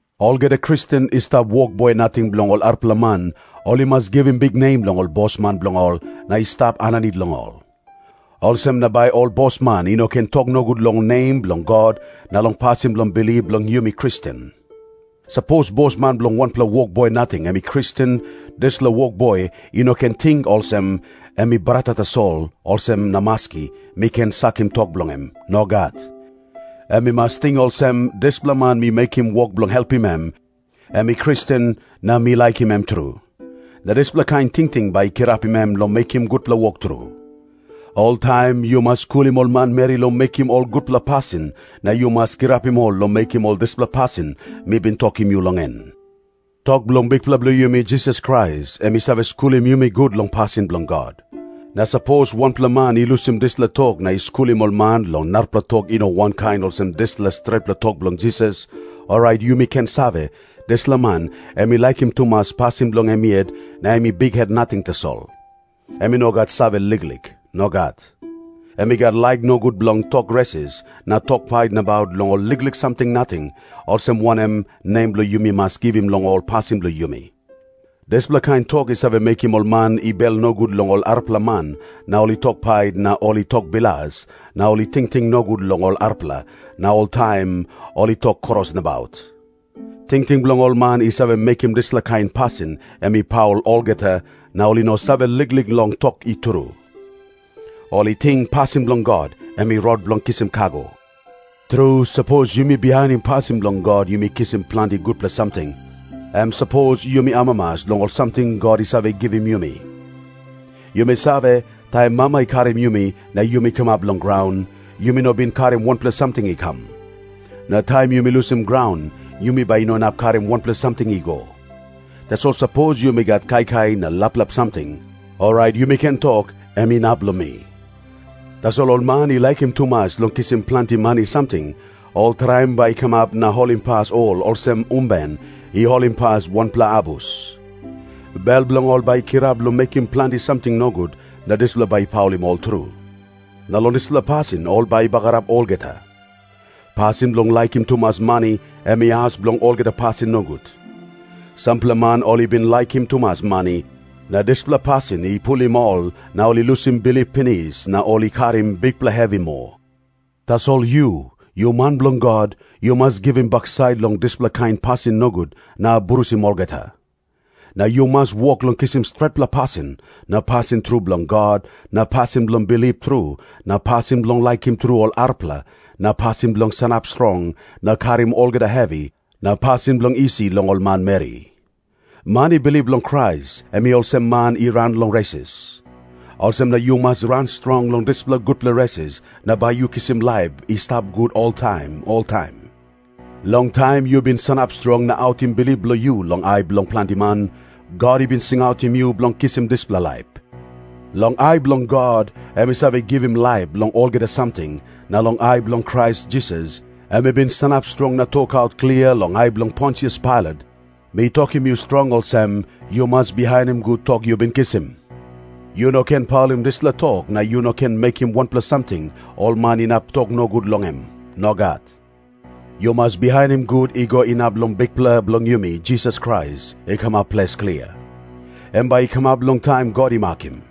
Olgeta Kristen i stap wokboi nating bilong ol arapela man, ol i mas givim biknem long ol bosman bilong ol na i stap aninit long ol. Olsem na bai ol bosman i no ken tok nogut long nem bilong God na long pasin bilong bilip bilong yumi Kristen. Sapos bosman bilong wanpela wokboi nating em i Kristen, dispela wokboi i no ken ting olsem, “Em i brata tasol, olsem na maski, mi ken sakim tok bilong em.” Nogat. Em i mas ting olsem, “Dispela man mi mekim wok bilong helpim em, em i Kristen, na mi laikim em tru.” Na dispela kain tingting bai i kirapim em long mekim gutpela wok tru. Oltaim yu mas skulim ol manmeri long mekim ol gutpela pasin na yu mas kirapim ol long mekim ol dispela pasin mi bin tokim yu long en. Tok bilong Bikpela bilong yumi Jisas Krais, em i save skulim yumi gut long pasin bilong God. Na sapos wanpela man i lusim dispela tok na i skulim ol man long narapela tok i no wankain olsem dispela stretpela tok bilong Jisas, orait yumi ken save, dispela man em i laikim tumas pasin bilong em yet na em i bikhet nating tasol. Em i no gat save liklik. Nogat. Em i gat laik nogut bilong tok resis na tok pait nabaut long ol liklik samting nating, olsem wanem nem yumi mas givim long ol pasin bilong yumi. Dispela kain tok i save mekim ol man i bel nogut long ol arapela man na ol i tok pait na ol i tok bilas na ol i tingting nogut long ol arapela na oltaim ol i tok kros nabaut. Tingting bilong ol man i save mekim dispela kain pasin em i paul olgeta, na ol i no save liklik long tok i tru. Ol i ting pasin bilong God em i rot bilong kisim kago. Tru, sapos yumi bihainim pasin bilong God yumi kisim planti gutpela samting, em sapos yumi amamas long ol samting God i save givim yumi. Yumi save, taim mama i karim yumi na yumi kamap long graun, yumi no bin karim wanpela samting i kam. Na taim yumi lusim graun yumi bai i no inap karim wanpela samting i go. Tasol sapos yumi gat kaikai na laplap samting, orait yumi ken tok, “Em inap long mi.” Tasol ol man i laikim tumas long kisim planti mani samting, ol traim bai i kamap na holimpas ol olsem umben i holimpas wanpela abus. Bel bilong ol bai i kirap long mekim planti samting nogut na dispela bai i paulim ol tru. Na long dispela pasin ol bai i bagarap olgeta. Pasin bilong laikim tumas mani em i as bilong olgeta pasin nogut. Sampela man ol i bin laikim tumas mani, na dispela pasin i pulim ol na ol i lusim bilip pinis, na ol i karim bikpela hevi moa. Tasol yu, yu man bilong God, yu mas givim baksait long ol dispela kain pasin nogut na abrusim olgeta. Na yu mas wok long kisim stretpela pasin na pasin tru bilong God na pasin bilong bilip tru na pasin bilong laikim tru ol arapela na pasin bilong sanap strong na karim olgeta hevi na pasin bilong isi long ol manmeri. Man i bilip long Krais, em i olsem man i ran long resis. Olsem na yu mas ran strong long dispela gutpela resis na bai yu kisim laip i stap gut oltaim oltaim. Long taim yu bin sanap strong na autim bilip bilong yu long ai bilong planti man, God i bin singautim yu bilong kisim dispela laip. Long ai bilong God, em i save givim laip long olgeta samting, na long ai bilong Krais Jisas, em i bin sanap strong na tokaut klia long ai bilong Pontius Pailat, mi tokim yu strong olsem, yu mas bihainim gut tok yu bin kisim. Yu no ken paulim dispela tok na yu no ken mekim wanpela samting ol man inap tok nogut long em. Nogat. Yu mas bihainim gut i go inap long Bikpela bilong yumi Jisas Krais i kamap ples klia. Em bai i kamap long taim God i makim.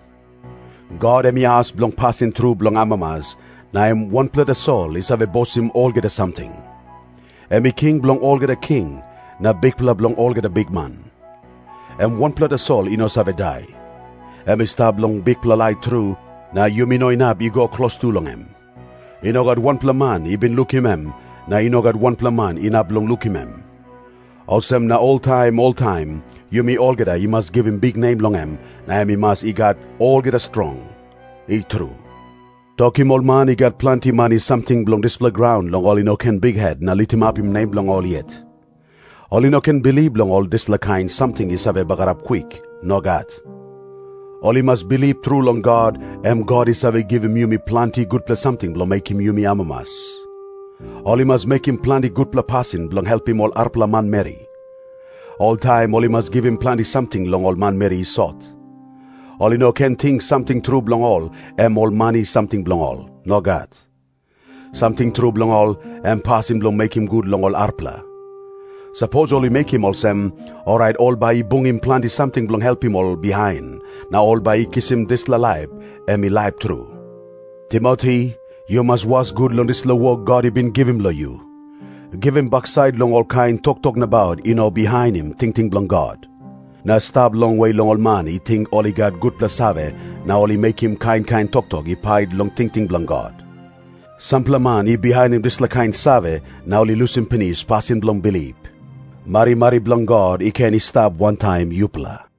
God em i as bilong pasin tru bilong amamas, na em wanpela tasol i save bosim olgeta samting. Em i King bilong olgeta king, na Bikpela bilong olgeta bikman. Em wanpela tasol i no save dai. Em i stap long bikpela lait tru, na yumi no inap i go klostu long em. I no gat wanpela man i bin lukim em, na i no gat wanpela man inap long lukim em. Olsem na oltaim oltaim yumi olgeta i mas givim biknem long em na em i mas i gat olgeta strong. I tru. Tokim ol man i gat planti mani samting bilong dispela graun long ol i no ken bikhet na litimapim nem bilong ol yet. Ol i no ken bilip long ol dispela kain samting i save bagarap kwik. Nogat. Ol i mas bilip tru long God, em God i save givim yumi planti gutpela samting bilong mekim yumi amamas. Ol i mas mekim planti gutpela pasin bilong helpim ol arapela manmeri. Oltaim ol i mas givim planti samting long ol manmeri i sot. Ol i no ken ting samting tru bilong ol em ol mani samting bilong ol. Nogat. Samting tru bilong ol, em pasin bilong mekim gut long ol arapela. Sapos ol i mekim olsem, orait ol bai i bungim planti samting bilong helpim ol bihain, na ol bai i kisim dispela laip em i laip tru. Timoti, yu mas was gut long dispela wok God i bin givim long yu. Givim baksait long olkain toktok nabaut i no bihainim tingting bilong God. Na stap longwe long ol man i ting ol i gat gutpela save na ol i mekim kain kain toktok i pait long tingting bilong God. Sampela man i bihainim dispela kain save na ol i lusim pinis pasin bilong bilip. Marimari bilong God i ken i stap wantaim yupela.